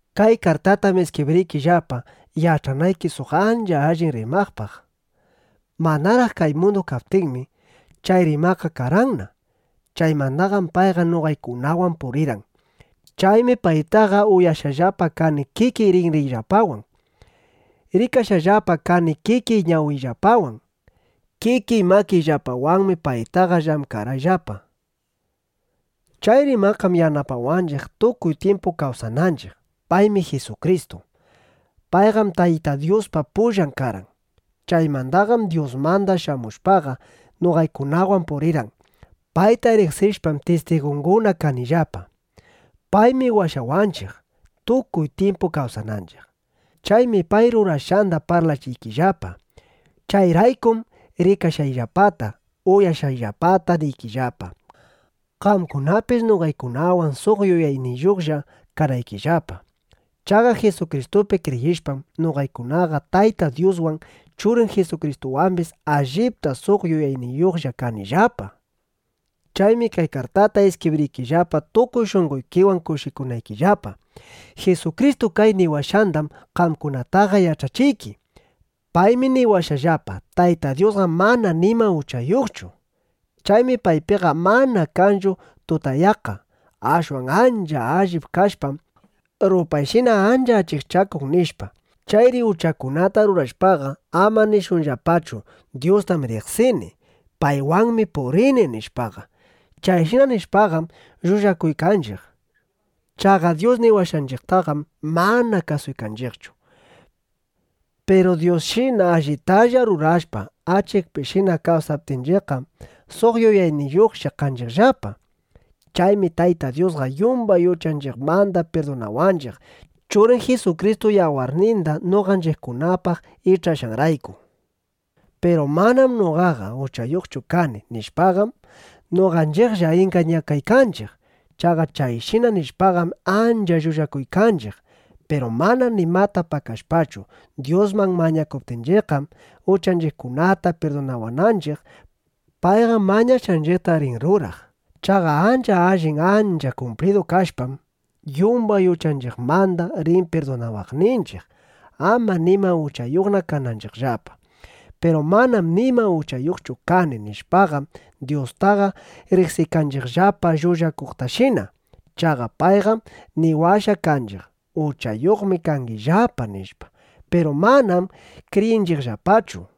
Kay kartatam iskibriykillapa, yach'anayki suq ancha allin Rimaqpaq. Manaraq kay mundu kaptinmi, chay Rimaqqa karqanna. Chaymandaqam payqa noqaykunawan purirqan. Chaymi paytaqa uyashqallapa kani kikiy rinriyllapawan. Rikashqallapa kani kikiy ñawiyllapawan. Kikiy makiyllapawanmi paytaqa llamkarqayllapa. Chay Rimaqqam yanapawanchiq, tukuy tyimpu kawsananchiq. (Paymi Jisukristu.) Payqam Tayta Dyuspa pullan karqan. Chaymandaqam Dyusmanda shamushpaqa, noqaykunawan purirqan. Payta riqsishpam, tistigunguna kanillapa. Paymi washawanchiq, tukuy tyimpu kawsananchiq. Chaymi pay rurashqanda parlachiykillapa. Chayraykum rikashqayllapata, uyashqayllapata niykillapa, qamkunapis noqaykunawan suq yuyayniyuqlla kanaykillapa. Chaqa Jisukristupi kriyishpam, noqaykunaqa Tayta Dyuswan, Churin Jisukristuwambis allipta suq yuyayniyuqlla kanillapa. Chaymi kay kartata iskibriykillapa, tukuy shunqoykiwan kushikunaykillapa. Jisukristu kay niwashqandam qamkunataqa yach'achiyki. Paymi niwashqallapa: “Tayta Dyusqam mana nima uchayuqchu. Chaymi paypiqa mana kanchu tutayaqqa. Ashwan ancha allin kashpam, rupayshina ancha achikchakun”, nishpa. Chayri uchakunata rurashpaqa, ama nishunllapachu: “Dyustam riqsini. Paywanmi purini”, nishpaqa. Chayshina nishpaqam, llullakuykanchiq. Chaqa Dyus niwashqanchiqtaqam mana kasuykanchiqchu. Piru Dyusshina allitalla rurashpa, achikpishina kawsaptinchiqqam, suq yuyayniyuqlla kanchiqllapa. Chaymi Tayta Dyusqa yumbay uchanchiqmanda pirdunawanchiq, Churin Jisukristu yawarninda noqanchiqkunapaq ich'ashqanrayku. Piru “Manam noqaqa uchayuqchu kani” nishpaqam, noqanchiqlla ingañakaykanchiq. Chaqa chayshina nishpaqam, ancha llullakuykanchiq. Piru mana nimata pakashpachu, Dyusman mañakuptinchiqqam, uchanchiqkunata pirdunawananchiq, payqam mañashqanchiqta rin ruraq. Chaqa ancha allin, ancha kumplidu kashpam, yumbay uchanchiqmanda rin pirdunawaqninchiq, ama nima uchayuqna kananchiqllapa. Piru “Manam nima uchayuqchu kani” nishpaqam, Dyustaqa riqsiykanchiqllapa llullakuqtashina. Chaqa payqam niwashqa kanchiq: “Uchayuqmi kangillapa”, nishpa. Piru manam kriyinchiqllapachu.